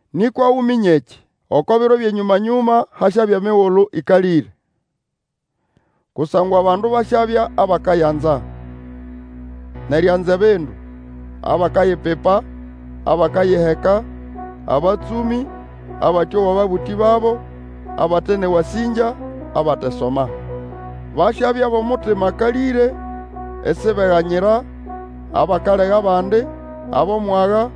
Nĩkwa Uminye ekĩ! Oko biro byʼenyũma-nyũma hasyabya emigulu ĩkalĩre. Kusangwa abandu basyabya abakayanza, nʼerianza ebindu, abakayipipa, abakayiheka, abatsũmĩ, abatĩowa ababũtĩ babo, abate nʼewasĩngya, abatesoma. Basyabya bʼomutima akalĩre, isibeganyira, abakalega abandi, abʼomwaga,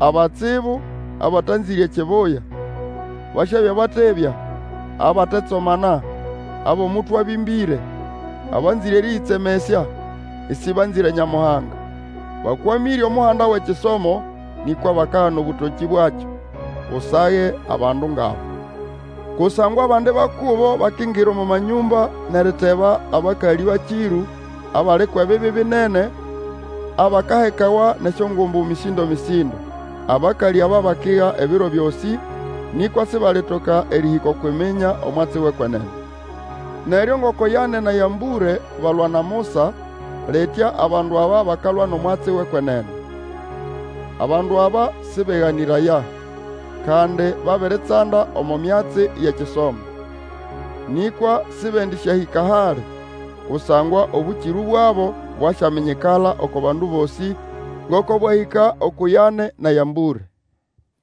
abatsibu, abatanzĩre ekibuya, basyabya batebya, abatetsomana, abʼomutwe abĩmbĩre, abanzĩre erĩyĩtsemesya, ĩsĩbanzĩre Nyamuhanga; bakwamĩre omuhanda wʼekisomo, nĩkwa bakagana obũtokĩ bwakyo. Usage abandu ngʼaba. Kusangwa abandi ba kubo bakingira omo manyũmba nʼeriteba abakalĩ bakĩrũ, abali kwʼebibi binene, abakahekawa nʼesyongumbu mĩsĩndo-mĩsĩndo. Abakalĩ aba bakiga ebiro byosĩ, nĩkwa sibalitoka erĩhĩka okwʼiminya omwatsi wʼekwenene. Neryo ngoko Yane na Yambũre balwa na Musa, litya abandu aba bakalwa nʼomwatsi wʼekwenene. Abandu aba sĩbeganĩraya, kandi babiritsanda omo myatsi yʼekisomo. Nĩkwa sĩbendĩsyahĩka hali, kusangwa obũkĩrũ bwabo bwasyaminyikala oko bandu bosĩ, ngoko bwahĩka uku Yane na Yambũre.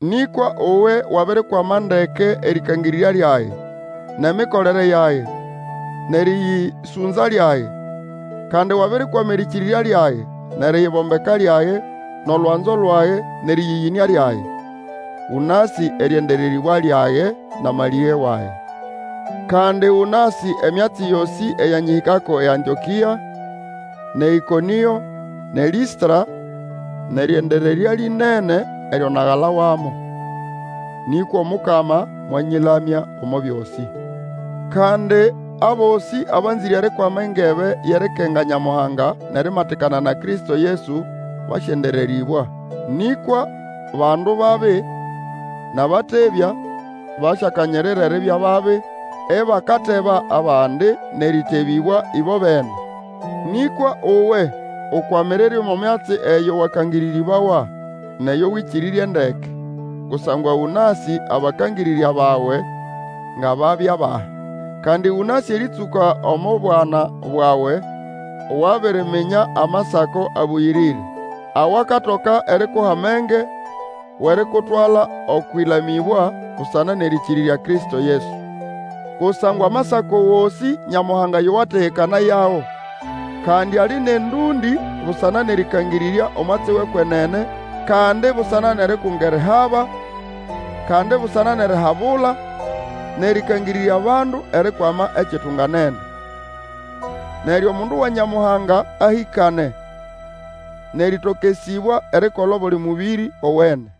Nĩkwa uwe wabirikwama ndeke erĩkangĩrĩrya lyage, nʼemikolere yage, nʼerĩyĩsũnza lyage; kandi wabirikwama erĩkĩrĩrya lyage, nʼeriyibombeka lyage, nʼolwanzo lwage, nʼerĩyĩyĩnĩa lyage. Ũnasĩ erĩendererĩbwa lyage nʼamalĩge wage. Kandi ũnasĩ emyatsi yosĩ eyanyĩhĩkako eAntĩokĩa, nʼeĨkonĩo, nʼeLĩstra, nʼerĩendererya lĩnene eryo nagalawamo! Nĩkwa Omukama mwanyĩlamya omo byosĩ. Kandi abosĩ abanzĩre erikwama engebe yʼerikenga Nyamuhanga nʼerimatikana na Kristo Yesu, basyendererĩbwa. Nĩkwa bandu babi, nʼabatebya, basyakanyirira eribya babi, ibakateba abandi nʼerĩtebĩbwa ĩbobene. Nĩkwa uwe ukwamirire omo myatsi eyo wakangĩrĩrĩbawa, nʼeyo Wĩkĩrĩrye ndeke. Kusangwa ũnasĩ abakangĩrĩrya bawe nga babya bahi. Kandi ũnasĩ erĩtsũka omo bwana bwawe wabiriminya Amasako Abũyĩrĩre, awakatoka erikuha amenge wʼerikutwala okwʼilamĩbwa busana nʼerĩkĩrĩrya Kristo Yesu. Kusangwa Amasako gosĩ Nyamuhanga yo wategekanayago. Kandi ali nʼendũndĩ busana nʼerĩkangĩrĩrya omwatsi wʼekwenene, kandi busana nʼerikunga erihaba, kandi busana nʼerihabula, nʼerĩkangĩrĩrya abandu erikwama ekitunganene. Neryo omundu wa Nyamuhanga ahĩkane, nʼerĩtokesĩbwa erikola obuli mũbĩrĩ owene.